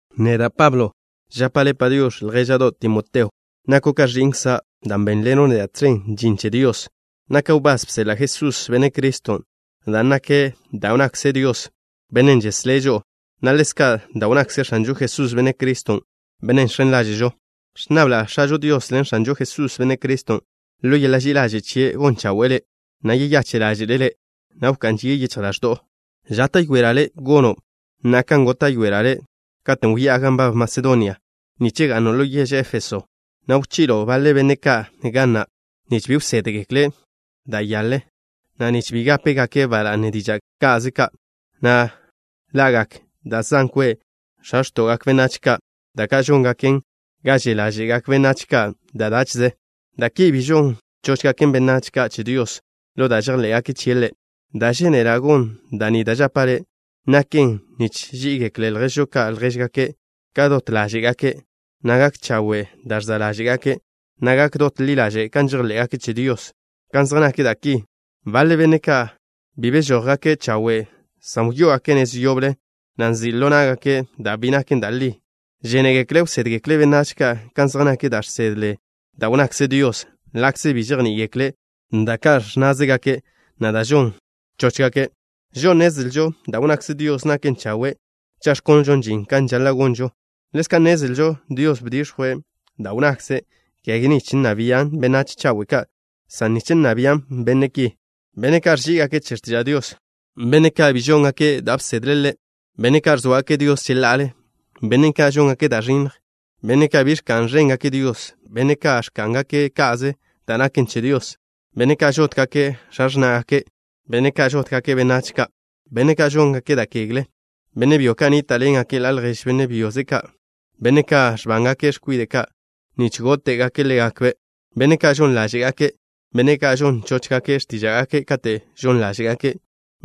Neda', Pablo, Žapa' le' “Padiox̱” ljéža'do' Timoteo. Nako' ka ẕi'nkza' dan' bénḻeno' neda' tẕen žin che Dios. Naka' wbás bseḻa' Jesús, Benne' Criston' dan' naken da' wnnakze Dios, Bennen' žeslé' žo'o, na' ḻezka' da' wnnakze X̱anžo Jesús, Benne' Criston', Bennen' žx̱en ḻáže'žo. Ẕnnabla' X̱ažo Dios ḻen X̱anžo Jesús, Benne' Criston', ḻo yeḻa' ži'i ḻaže' chie' gon chawe'e le', na' yeyache' ḻáže'le' le', na' wká'n žie' yichj ḻaẕdo'o. Žáta'yoela' le' gono' na'a kan góta'yoela' le' katen' wyá'a gan nbab Masedonia, nich ga'no' ḻo yež Éfeso, na' wchi'lo' baḻe benne' ka' ga na' nich bi wsédgekle' to da' nyaḻen, na' nich bi gápegake' ba la'ne diža' ka'ze ka', na' lagak da' zan kwe' x̱a x̱to'gak benách ka', da' ka' žóngaken ga že' ḻáže'gak benách ka' da' dáche'ze. Da' ki bi žon chóchgaken benách ka' che Dios ḻo da' žejḻé'gake' chie' Ḻe'. Da' žénela' gon da' ni da' žapa' le', naken nich ží'igekle lježžo ka' ljéžgake' ka' dot ḻáže'gake', na' gak chawe' da' ẕza' ḻáže'gake', na' gak dot ḻi ḻaže' kan žejḻé'gake' che Dios. Kan zej nak da' ki, baḻe benne' ka' bi bežójgake' chawe', san wyó'ogake' nez yoble, na' nzi' ḻo ná'gake' da' bi naken da' li. Žénegekle' wsédgekle' benách ka' kan zej nak da' žsedle da' wnnakze Dios, ḻa'kze bi žejní'igekle' da' ka' ẕnnázegake', na' da' žon chóchgake'. Žo'o nnezlžo da' wnnakze Dios naken chawe', cha' ẕkonlžon žin kan žaḻa' gonžo. Ḻezka' nnezlžo Dios bdix̱jwe' da' wnnakze', kege nich nna bian' benách chawe' ka', san nich nna bian' benne' ki: Benne' ka' ẕží'igake' che x̱tiža' Dios, benne' ka' bi žóngake' da' bsedle' Ḻe', benne' ka' ẕzóagake' Dios cheḻa'ale, benne' ka' žóngake' da' ẕinnj, benne' ka' bi ẕka'n ẕéngake' Dios, benne' ka' ẕká'ngake' ka'ze da' naken che Dios, benne' ka' žótgake' x̱a x̱ná'gake', benne' ka' žótgake' benách ka', benne' ka' žóngake' da' kegle, benne' byo ka' nníta'ḻengake' ḻa' ljež benne' byoze' ka', benne' ka' ẕbángake' x̱kwide' ka' nich góte'gake' ḻégakbe', benne' ka' žon ḻáže'gake', benne' ka' žon chóchgake' x̱tíža'gake' kate' žon ḻáže'gake',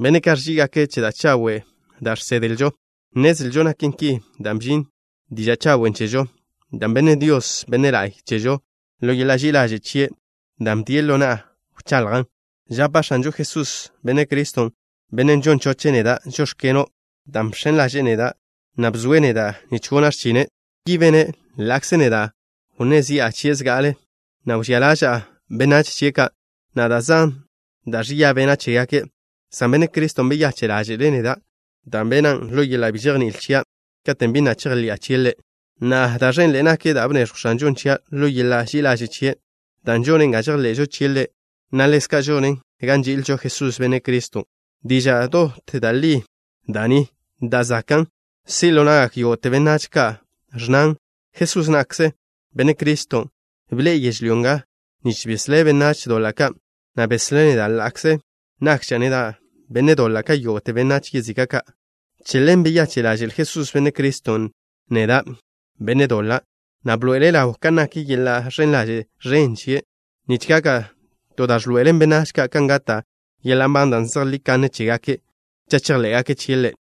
benne' ka' ẕží'igake' che da' chawe' da' žsedlžo. Nnezlžo naken ki dan' bžin diža' chawen' chežo, da' benn Dios, Benne' la'y, chežo ḻo yeḻa' ži'i ḻaže' chie', dan' bdie' ḻo na'a wchaḻjan'. Žapa' X̱anžo Jesús, Benne' Criston', Bennen' žon choche' neda': “Žóx̱keno'” dan' bx̱en ḻaže'e neda', na' bzoe' neda' nich gona' x̱chine'. Ki bene' ḻa'kze neda' wnné zi'a chie' zga'ale, na' wžía ḻaža'a benách chie' ka', na' da' zan da' ẕia bena' chégake', san Benne' Criston' beyache' ḻáže'le' neda', dan' benan' ḻo yeḻa' bi žejní'il chia' katen' bi na' chejḻi'a chie' Ḻe'. Na'a, da' ẕenḻe'e nak da' bneẕjw X̱anžon' chia' ḻo yeḻa' ži'i ḻaže' chie', dan' žonen ga žejḻe'žo chie' Ḻe', na' ḻezka' žonen ga nži'ilžo Jesús, Benne' Criston'. Diža' dot da' li da' ni, da' zakan' si' ḻo na'gak yógo'te benách, na' ẕnnan: “Jesús na'kze, Benne' Criston', bḻe'e yežlyó nga nich beslé' benách doḻa' ka'” na' beslé' neda' ḻa'kze nakža' neda' benne' doḻa' ka yógo'te benách yezika' ka'. Che ḻen beyache' ḻaže'l Jesús, Benne' Criston', neda', benne' doḻa', na' bḻoe'ele' ḻaw kan nak yeḻa' ẕen ḻaže' ẕen chie', nich gaka' to da' ẕḻoe'elen benách ka' kan gata' yeḻa' nban da' zejlí kanne chégake', cha' chejḻé'gake' chie' Ḻe'.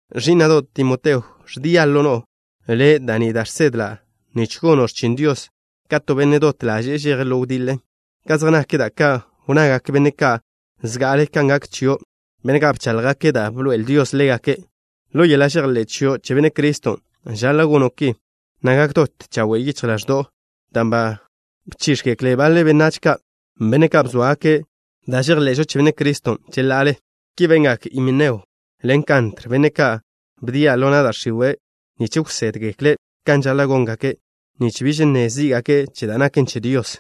Ẕí'na'do' Timoteo, ẕdia' ḻo no'o le' da' ni da' žsedla' nich gono' x̱chin Dios ka to benne' dot ḻaže'e žeje' ḻo wdiḻe, ka zej nak da' ka' wnnagak benne' ka' zga'ale kan gak chio', benne' ka' bcháḻjgake' da' bḻoe'el Dios ḻégake'. Ḻo yeḻa' žejḻé' chio' che Benne' Criston' žaḻa' gono' ki, nak dot chawe' yichj ḻaẕdo'o, dan' ba bchíx̱gekle baḻe benách ka', benne' ka' bzóagake' da' žejḻe'žo che Benne' Criston' cheḻa'ale. Ki bengak Himeneo ḻen Kantr, benne' ka' bdia' ḻo na' da' x̱iwe' nich wsédgekle' kan žaḻa' góngake', nich biž nne zí'gake' che da' naken che Dios.